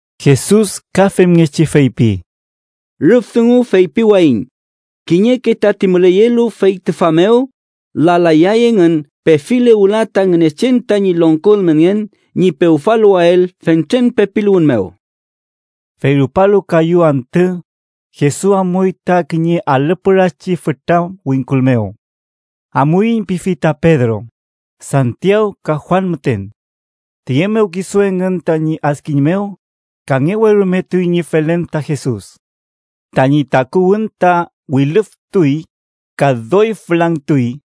Jesus ka femngechi feypi: —Rüf dungu feypiwayiñ kiñeke tati müleyelu fey tüfa mew lalayay engün pefile wüla ta Ngünechen tañi longko ülmenngen ñi pewfaluwael fentren pepiluwün mew. Fey rupalu kayu antü, Jesus amuy ta kiñe alü pürachi fütra wingkul mew. “Amuiñ” pifi ta Pedro, Santiaw, ka Juan müten. Tiye mew kisu engün tañi adkiñ mew, kangewerumetuy ñi felen ta Jesus. Tañi takuwün ta wilüfütuy ka doy fülangtuy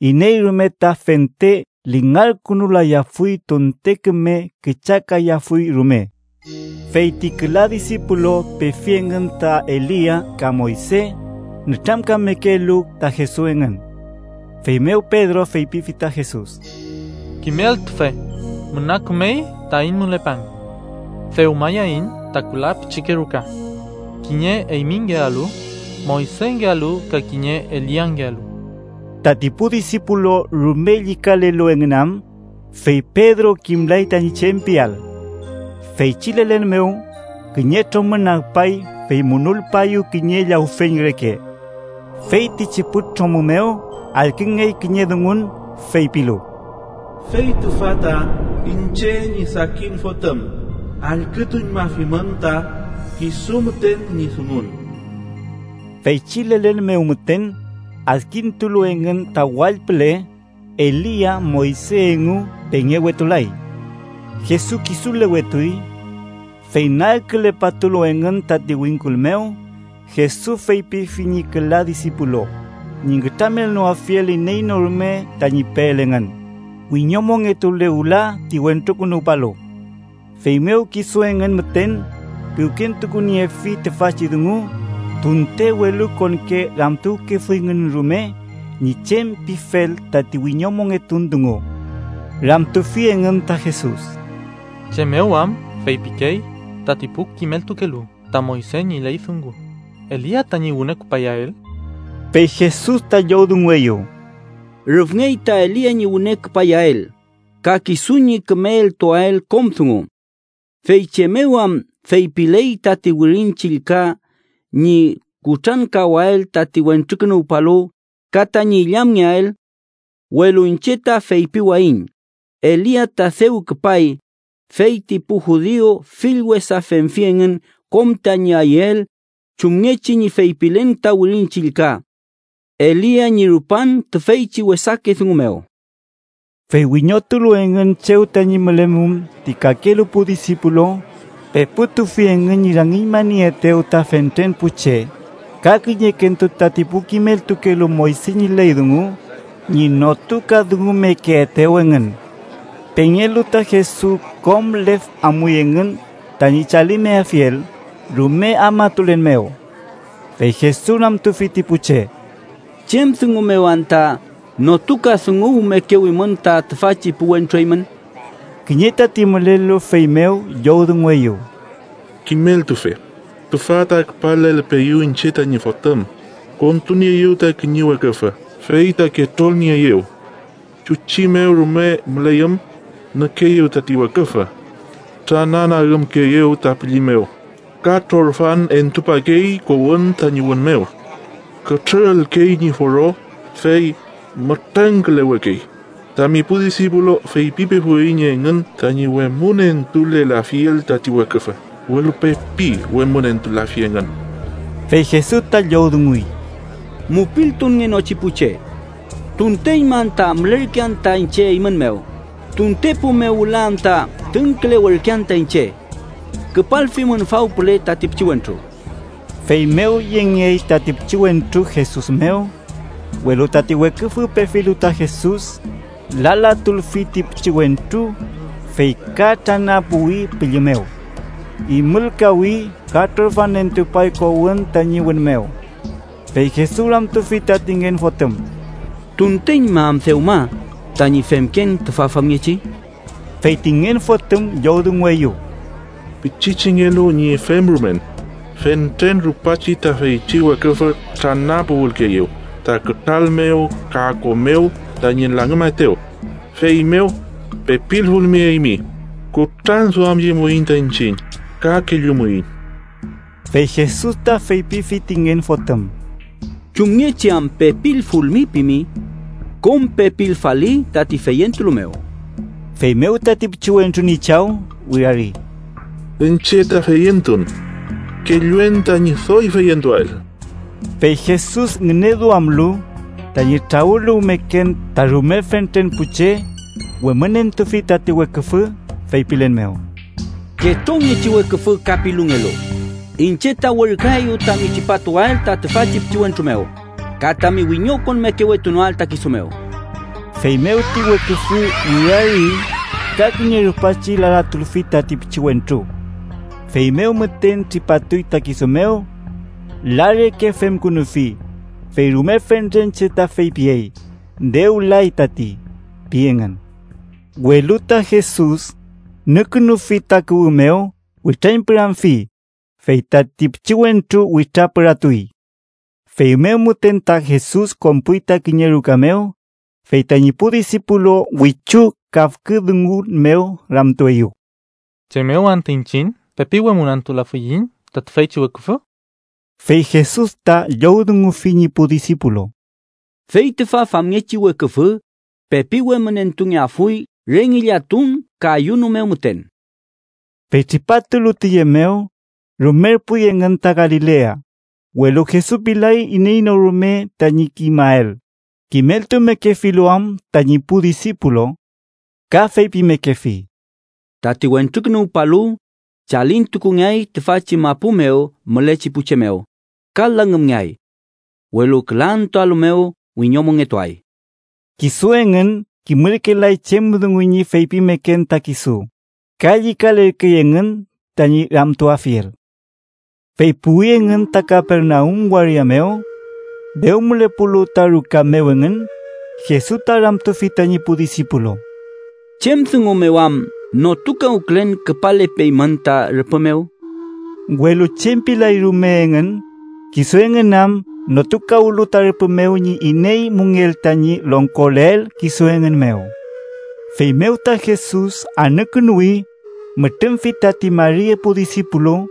iney rume ta fente lingarkünulayafuy tunte küme küchakayafuy rume. Fey ti küla disipulu pefi engün ta Elia ka Moyse, nütramkamekelu ta Jesus engün. Feymew Pedro feypifi ta Jesus: —Kimeltufe, ¡müna kümey taiñ mülepan! Dewmayaiñ ta küla pichike ruka: kiñe eymingealu, Moysengealu ka kiñe Eliangealu. Tati pu disipulu rume llükalelu engün am, fey Pedro kimlay tañi chem piael. Feychi lelen mew, kiñe tromü nagpay fey munulpaeyew kiñe llawfeñ reke. Feytichi pu tromü mew allküngey kiñe dungun, feypilu: “¡Fey tüfa ta iñche ñi sakin Fotüm: allkütuñmafimün ta kisu müten ñi dungun!” Feychi lelen mew müten, adkintulu engün ta wall püle, Elia Moyse engu pengewetulay. Jesus kisulewetuy. Fey nagkülepatulu engün tati wingkul mew, Jesus feypifi ñi küla disipulu ñi nütramelnoafiel iney no rume tañi peel engün, wiñomongetule wüla ti Wentrukünuwpalu. Feymew kisu engün müten piwkentukuniefi tüfachi dungu, tunte welukonke ramtuwkefuyngün rume ñi chem pifel tati wiñomongetun dungu. Ramtufi engün ta Jesus: —¿Chem mew am feypikey tati pu kimeltukelu ta Moyse ñi ley dungu Elia tañi wüne küpayael? Fey Jesus ta llowdungueyew: —Rüfngey ta Elia ñi wüne küpayael, ka kisu ñi küme eltuael kom dungu. ¿Fey chem mew am feypiley tati Wirin Chillka ñi kutrankawael tati Wentrukünuwpalu ka tañi illamngeael? Welu iñche ta feypiwayiñ Elia ta dew küpay, fey ti pu judiu fill wesa femfi engün kom tañi ayüel chumngechi ñi feypilen ta Wirin Chillka Elia ñi rupan tüfeychi wesake dungu mew. Fey wiñotulu engün chew tañi mülemum ti kakelu pu disipulu, peputufi engün ñi rangiñmanieetew ta fentren pu che, ka kiñekentu tati pu kimeltukelu Moyse ñi ley dungu ñi notukadungumekeetew engün. Pengelu ta Jesus, kom lef amuy engün tañi chalimeafiel rume afmatulen mew. Fey Jesus ramtufi ti pu che: —¿Chem dungu mew anta notukadunguwmekewimün ta tüfachi pu wentru eymün? Kiñe tati mülelu feymew llowdungueyew: —Kimeltufe, tüfa ta küpalelpeeyu iñche tañi fotüm, kontunieeyew ta kiñe weküfü fey ta ketrolnieeyew. Chuchi mew rume müleyüm, nükeeyew tati weküfü. Trananagümkeeyew ta pülli mew ka trorfan entupakey kowün tañi wün mew. Kütrürülkey ñi foro, fey mütrengkülewekey. Tami pu disipulu feypipefuiñ engün tañi wemünentulelafiel tati weküfü, welu pepi wemünentulafi engün. Fey Jesus ta llowdunguy: —¡Mupiltunngenochi pu che! ¿Tunteñma anta mülerkean ta iñche eymün mew? ¿Tuntepu mew wüla anta tüngkülewerkean ta iñche? Küpalfimün faw püle tati pichiwentru. Feymew yengey tati pichiwentru Jesus mew. Welu tati weküfü, pefilu ta Jesus, lalatulfi ti pichiwentru, fey ka tranapuwi pülli mew. Imülkawi, ka trorfan entupay kowün tañi wün mew. Fey Jesus ramtufi tati ngen fotüm: —¿Tunteñma am dewma tañi femken tüfa famngechi? Fey ti ngen fotüm llowdungueyew: —Pichichengelu ñi femrumen. Fentren rupachi ta feychi weküfü tranapuwülkeeyew ta kütral mew ka ko mew tañi langümaetew. Feymew, pepilfulmi eymi, kutranduamyemuiñ ta iñchiñ ka kellumuiñ. Fey Jesus ta feypifi ti ngen fotüm: —¿Chumngechi am pepilfulmi pimi? ¡Kom pepilfali tati feyentulu mew! Feymew tati pichiwentru ñi chaw wirari: —Iñche ta feyentun. ¡Kelluen tañi doy feyentuael! Fey Jesus ngüneduamlu tañi trawüluwmeken ta rume fentren pu che, wemünentufi tati weküfü, feypilen mew: —Ketrongechi weküfü ka pilungelu, iñche ta werküaeyu tami tripatuael ta tüfachi pichiwentru mew ka tami wiñokonmeketunoael ta kisu mew. Feymew ti weküfü wirari, ka kiñe rupachi lalatulfi tati pichiwentru. Feymew müten tripatuy ta kisu mew. La reke femkünufi, fey rume fentren che ta feypiyey “dew lay tati” pi engün. Welu ta Jesus, nükünufi ta kuwü mew, witrañpüramfi, fey tati pichiwentru witrapüratuy. Feymew müten ta Jesus konpuy ta kiñe ruka mew, fey tañi pu disipulu wichu kafkü dungun mew ramtueyew: —¿Chem mew anta iñchiñ pepi wemünentulafiyiñ ta tüfeychi weküfü? Fey Jesus ta llowdungufi ñi pu disipulu: —Fey tüfa famngechi weküfü pepi wemünentungeafuy re ngillatun ka ayuno mew müten. Fey tripatulu tiye mew, rumerpuy engün ta Galilea, welu Jesus pilay iney no rume tañi kimael, kimeltumekefilu am tañi pu disipulu. Ka feypimekefi: “Tati Wentrukünuwpalu chalintukungeay tüfachi mapu mew mülechi pu che mew ka langümngeay. Welu küla antüalu mew wiñomongetuay.” Kisu engün kimürkelay chem dungu ñi feypimeken ta kisu, ka llükalerkey engün tañi ramtuafiel. Fey puwi engün ta Kapernaum waria mew. Dew mülepulu ta ruka mew engün, Jesus ta ramtufi tañi pu disipulu: —¿Chem dungu mew am notukawkülen küpalepeymün ta rüpü mew? Welu chem pilay rume engün, kisu engün am notukawlu ta rüpü mew iney müngell tañi longkoleael kisu engün mew. Feymew ta Jesus anükünuwi, mütrümfi tati mari epu disipulu,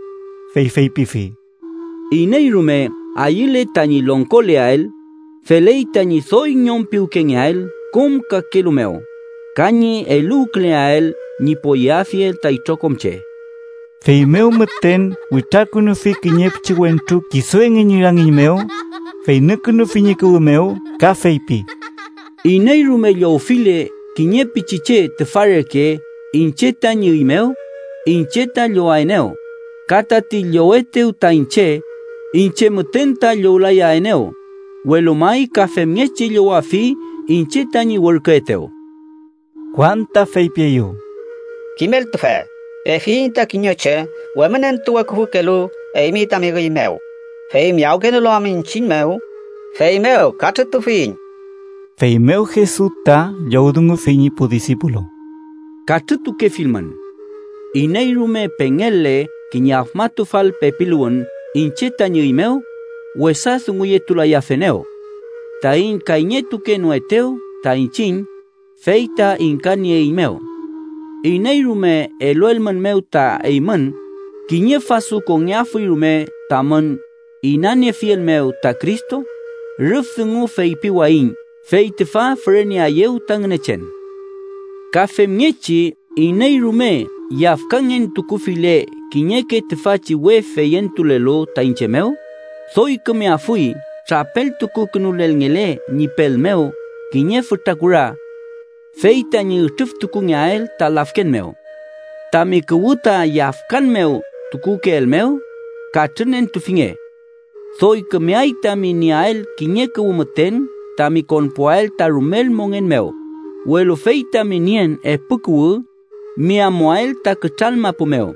fey feypifi: —Iney rume ayüle tañi longkoleael, feley tañi doy ñom piwkengeael kom kakelu mew, ka ñi eluwküleael ñi poyeafiel ta itrokom che. Feymew müten witrakünufi kiñe pichiwentru kisu engün ñi rangiñ mew, fey nükünufi ñi kuwü mew ka feypi: —Iney rume llowfile kiñe pichiche tüfa reke iñche tañi üy mew, iñche ta llowaenew. Ka tati llowetew ta iñche, iñche müten ta llowlayaenew, welu may ka femngechi llowafi iñche tañi werküetew. Juan ta feypieyew: —Kimeltufe, pefiyiñ ta kiñe che wemünentuweküfükelu eymi tami üy mew, fey miyawkenolu am iñchiñ mew, feymew katrütufiyiñ. Feymew Jesus ta llowdungufi ñi pu disipulu: —Katrütukefilmün. Iney rume pengel-le kiñe afmatufal pepiluwün iñche tañi üy mew, wesa dunguyetulayafenew. Taiñ kayñetukenoetew ta iñchiñ, fey ta ingkanieeiñmew. Iney rume eluelmünmew ta eymün kiñe fasu kongeafuy rume tamün inaniefiel mew ta Cristo, rüf dungu feypiwayiñ fey tüfa füreneaeyew ta Ngünechen. “Ka femngechi iney rume yafkangen tukufile kiñeke tüfachi we feyentulelu ta iñche mew, doy kümeafuy trapeltukukünulelngele ñi pel mew kiñe fütra kura, fey tañi ütrüftukungeael ta lafken mew. “Tami kuwü ta yafkan mew tukukeelmew, katrünentufinge. Doy kümeay tami nieael kiñe kuwü müten tami konpuael ta rumel mongen mew, welu fey tami nien epu kuwü, mi amuael ta kütral mapu mew,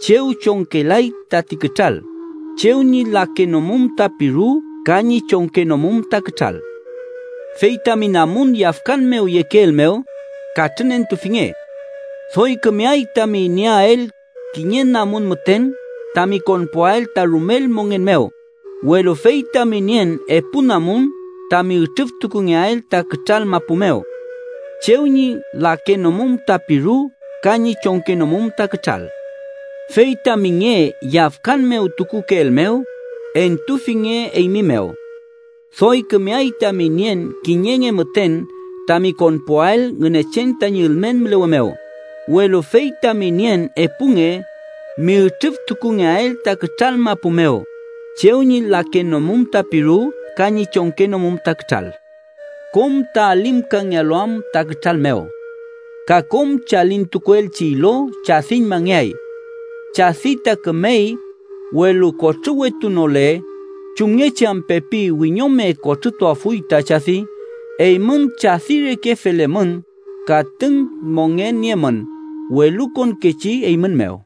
chew chongkelay tati kütral, chew ñi lakenomum ta piru ka ñi chongkenomum ta kütral. “Fey tami namun yafkan mew yekeelmew, katrünentufinge. Doy kümeay tami nieael kiñe namun müten tami konpuael ta rumel mongen mew, welu fey tami nien epu namun tami ütrüftukungeael ta kütral mapu mew. Chew ñi lakenomum ta piru ka ñi chongkenomum ta kütral. “Fey tami nge yafkan mew tukukeelmew, entufinge eymi mew. Doy kümeay tami nien kiñe nge müten tami konpuael Ngünechen tañi ülmen mülewe mew, welu fey tami nien epu nge mi ütrüftukungeael ta kütral mapu mew ‘chew ñi lakenomum ta piru ka ñi chongkenomum ta kütral.’ Kom ta alimkangealu am ta kütral mew. Ka kom chalintukuelchi ilo chadiñmangeay. “Chadi ta kümey, welu kotrüwetunole, ¿chumngechi am pepi wiñome kotrütuafuy ta chadi? Eymün chadi reke felemün ka tüng mongen niemün welukonkechi eymün mew.”